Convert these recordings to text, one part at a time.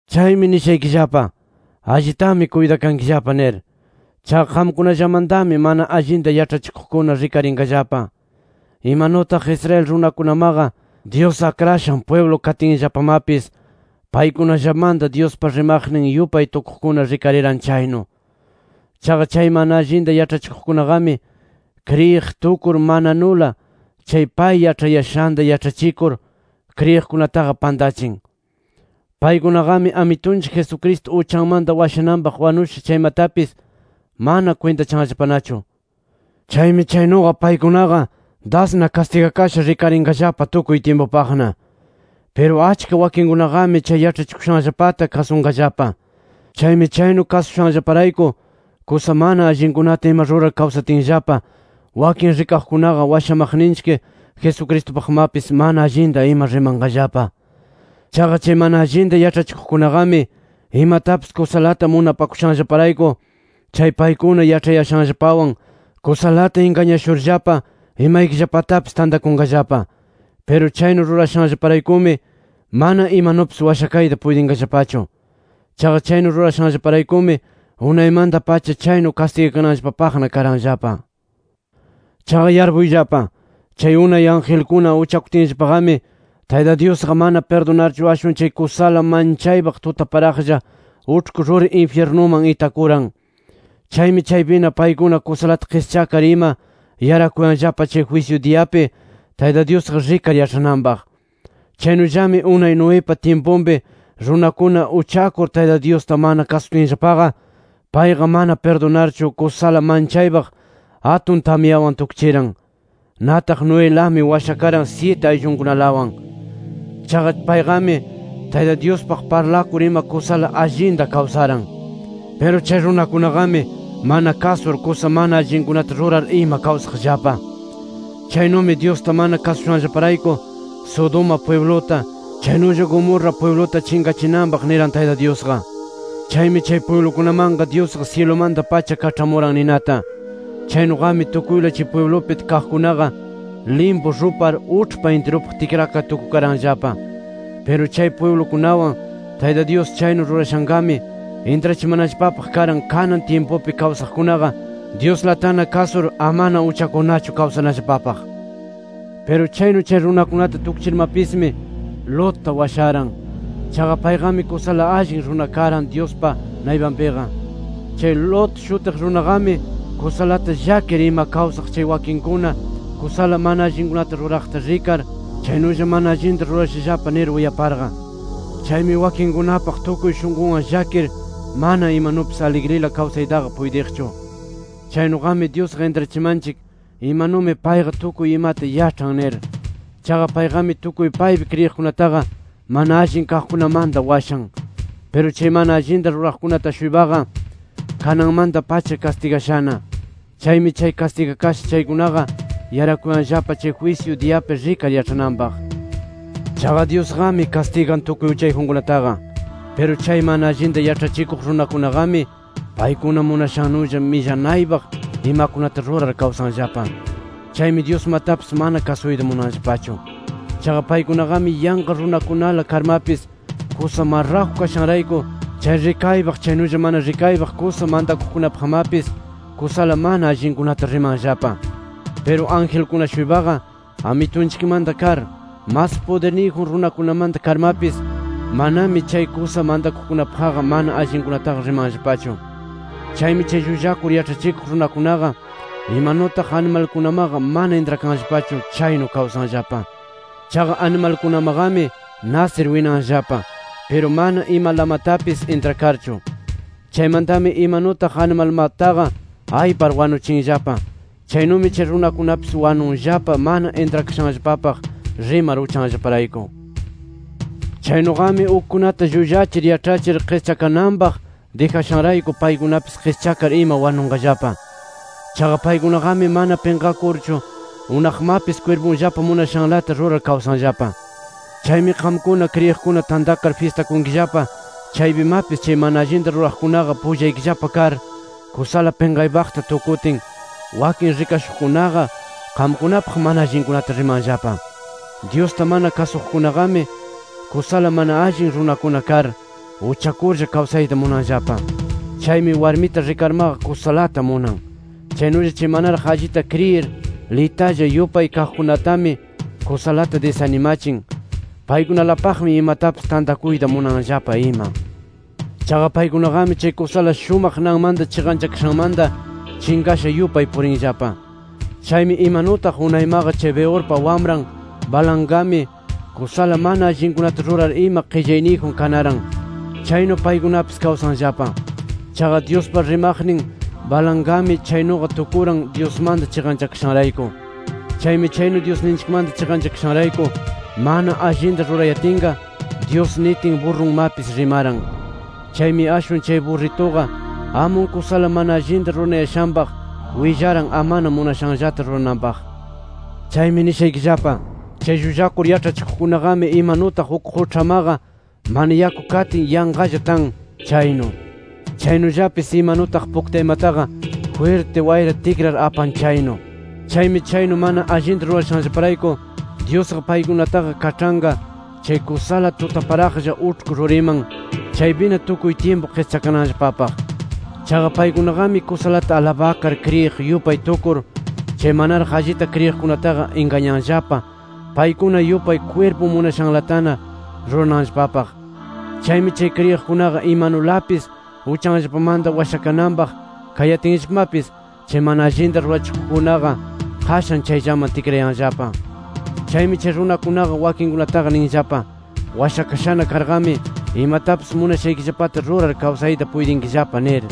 Chaymi nishaykillapa: Allitami kuytakankillapa nir. Chaqa qamkunallamantami mana allinta yaĉhachikuqkuna rikarinqallapa. Imanutaq Israel runakunamaqa Dyus akrashan pwiblu katinllapamapis, paykunallamanta Dyuspa rimaqnin yupay tukuqkuna rikariran chaynu. Chaqa chay mana allinta yaĉhachikuqkunaqami, kriyiq tukur mananula chay pay yaĉhayashanta yaĉhachikur, kriyiqkunataqa pantachin. Paykunaqami Amitunchik Jesucristo uchanmanta washananpaq wanusha chaymatapis manana kwintachanllapanachu. Chaymi chaynuqa paykunaqa dasna kastigakasha rikarinqallapa tukuy tyimpupaqna. Piru achka wakinkunaqami chay yaĉhachikushanllapata kasunqallapa. Chaymi chaynu kasushanllaparayku kusa mana allinkunata ima rurar kawsatinllapa, wakin rikaqkunaqa washamaqninchik Jesucristupaqmapis mana allinta ima rimanqallapa. Chaqa chay mana allinta yaĉhachikuqkunaqami, imatapis kusalata munapakushanllaparayku chay paykuna yaĉhayashanllapawan kusalata ingañashurllapa imaykillapatapis tantakunqallapa. Piru chaynu rurashanllaparaykumi, mana imanupis washakayta puytinqallapachu. Chaqa chaynu rurashanllaparaykumi unaymanta-pacha chaynu kastigakananllapapaqna karanllapa. Chaqa yarpuyllapa: Chay unay angelkuna uchakutinllapaqami, Tayta Dyusqa mana pirdunarchu ashwan chay kusala manchaypaq tutaparaqlla uĉhku ruri infyirnuman itakuran. Chaymi chaypina paykuna, kusalata qischakar ima yarakuyanllapa chay jwisyu diyapi Tayta Dyusqa rikar yaĉhananpaq. Chaynullami unay Noepa tyimpunpi runakuna uchakur Tayta Dyusta mana kasutinllapaqa, payqa mana pirdunarchu kusala manchaypaq atun tamyawan tukchiran. Nataq Noelami washakaran syiti ayllunkunalawan. Chaqa payqami Tayta Dyuspaq parlakur ima kusala allinta kawsaran. Piru chay runakunaqami mana kasur, kusa mana allinkunata rurar ima kawsaqllapa. Chaynumi Dyusta mana kasushanllaparayku, Sodoma pwibluta, chaynulla Gomorra pwibluta chinqachinanpaq niran Tayta Dyusqa. Chaymi chay pwiblukunamanqa Dyusqa syilumanta-pacha kaĉhamuran ninata. Chaynuqami tukuyla chay pwiblupi kaqkunaqa limpu rupar uĉhpa intirupaq tikrakar tukukaranllapa. Piru chay pwiblukunawan Tayta Dyus chaynu rurashanqami intrachimanallapapaq karan kanan tyimpupi kawsaqkunaqa Dyuslatana kasur amana uchakurnachu kawsanallapapaq. Piru chaynu chay runakunata tukchirmapismi, Lotta washaran. Chaqa payqami kusala allin runa karan Dyuspa naypanpiqa. Chay Lot shutiq runaqami kusalata llakir ima kawsaq chay wakinkuna kusala mana allinkunata ruraqta rikar, chaynulla mana allinta rurashallapa nir uyaparqa. Chaymi wakinninkunapaq tukuy shunqunwan llakir mana imanupis aligrila kawsaytaqa puytiqchu. Chaynuqami Dyusqa intrachimanchik imanumi payqa tukuy imata yaĉhan nir. Chaqa payqami tukuy paypi kriyiqkunataqa, mana allin kaqkunamanta washan. Piru chay mana allinta ruraqkunata-shuypaqa, kananmanta-pacha kastigashana. Chaymi chay kastigakasha chaykunaqa yarakuyanllapa, chay jwisyu diyapi rikar yaĉhananpaq. Chaqa Dyusqami kastigan tukuy uchayjunkunataqa. Piru chay mana allinta yaĉhachikuq runakunaqami, paykuna munashannulla millanaypaq imakunata rurar kawsanllapa. Chaymi Dyusmatapis mana kasuyta munanllapachu. Chaqa paykunaqami yanqa runakunala karmapis kusa marraju kashanrayku, chay rikaypaq chaynulla mana rikaypaq kusa mantakuqkunapaqmapis kusala mana allinkunata rimanllapa. Piru angelkuna-shuypaqa Amitunchikmanta kar, mas pudirniyjun runakunamanta karmapis, manami chay kusa mantakuqkunapaqqa mana allinkunataqa rimanllapachu. Chaymi chay llullakur yaĉhachikuq runakunaqa, imanutaq animalkunamaqa mana intrakanllapachu chaynu kawsanllapa. Chaqa animalkunamaqami nasir winanllapa, piru mana imalamatapis intrakarchu. Chaymantami imanutaq animalmataqa aypar wanuchinllapa, chaynumi chay runakunapis wanunllapa mana intrakashanllapapaq rimar uchanllaparayku. Chaynuqami ukkunata llullachir yaĉhachir qischakananpaq dijashanrayku, paykunapis qischakar ima wanunqallapa. Chaqa paykunaqami mana pinqakurchu unaqmapis kwirpunllapa munashanlata rurar kawsanllapa. Chaymi qamkuna kriyiqkuna tantakar fyistakunkillapa chaypimapis, chay mana allinta ruraqkunaqa pullaykillapa kar, kusala pinqaypaqta tukutin, wakin rikashuqkunaqa qamkunapaq mana allinkunata rimanllapa. Dyusta mana kasuqkunaqami kusala mana allin runakuna kar, uchakurlla kawsayta munanllapa. Chaymi warmita rikarmaqa kusalata munan. Chaynulla chay manaraq allita kriyir, litalla yupay kaqkunatami kusalata disanimachin. Paykunalapaqmi imatapis tantakuyta munanllapa ima. Chaqa paykunaqami chay kusala shumaq nanmanta chiqanchakashanmanta, chinqasha yupay purinllapa. Chaymi imanutaq unaymaqa chay Beorpa wamran Balaamqami kusala mana allinkunata rurar ima qillayniyjun kanaran, chaynu paykunapis kawsanllapa. Chaqa Dyuspa rimaqnin Balaamqami, chaynuqa tukuran Dyusmanta chiqanchakashanrayku. Chaymi chaynu Dyusninchikmanta chiqanchakashanrayku mana allinta rurayatinqa, Dyus nitin burrunmapis rimaran. Chaymi ashwan chay burrituqa amun kusala mana allinta ruranayashanpaq willaran, amana munashanllata rurananpaq. Chaymi nishaykillapa: Chay llullakur yaĉhachikuqkunaqami, imanutaq uk quĉhamaqa mana yaku katin yanqalla tan, chaynu. Chaynullapis imanutaq puktaymataqa jwirti wayra tikrar apan chaynu. Chaymi chaynu mana allinta rurashanllaparayku, Dyusqa paykunataqa kaĉhanqa chay kusala tutaparaqlla uĉhku ruriman, chaypina tukuy tyimpu qischakananllapapaq. Chaqa paykunaqami kusalata alabakar kriyiq yupay tukur, chay manaraq allita kriyiqkunataqa ingañanllapa paykuna yupay kwirpun munashanlatana rurananllapapaq. Chaymi chay kriyiqkunaqa imanulapis uchanllapamanta washakananpaq kayatinllapamapis, chay mana allinta rurachikuqkunaqa qashan chayllaman tikrayanllapa. Chaymi chay runakunaqa wakinkunataqa ninllapa: “Washakashana karqami imatapis munashaykillapata rurar kawsayta puytinkillapa” nir.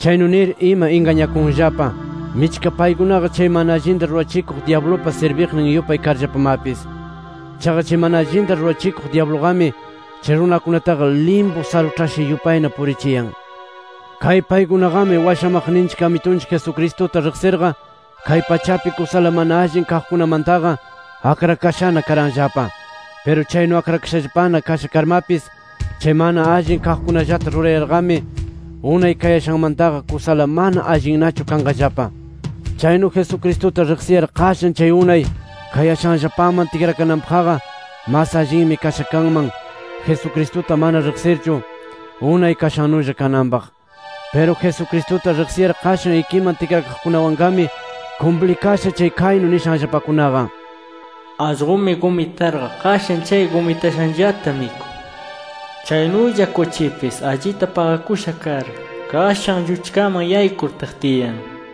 Chaynu nir ima ingañakunllapa, michka paykunaqa chay mana allinta rurachikuq dyablupa sirbiqnin yupay karllapamapis. Chaqa chay mana allinta rurachikuq dyabluqami, chay runakunataqa limpu saruĉhasha yupayna purichiyan. Kay paykunaqami washamaqninchik Amitunchik Jesucristuta riqsirqa, kay pachapi kusala mana allin kaqkunamantaqa akrakashana karanllapa. Piru chaynu akrakashallapana kasha karmapis, chay mana allin kaqkunallata rurayarqami, unay kayashanmantaqa kusala mana allinnachu kanqallapa. Chaynu Jesucristuta riqsiyar qashan chay unay kayashanllapaman tikrakananpaqqa, mas allinmi kasha kanman Jesucristuta mana riqsirchu, unay kashannulla kananpaq. Piru Jesucristuta riqsiyar qashan ikiman tikrakaqkunawanqami kumplikasha chay kaynu nishanllapakunaqa: “Allqumi gumitarqa qashan chay gumitashanllata mikun”. Chaynulla “Kuchipis allita paqakusha kar, qashan lluchkaman yaykur tiqtiyan” nir.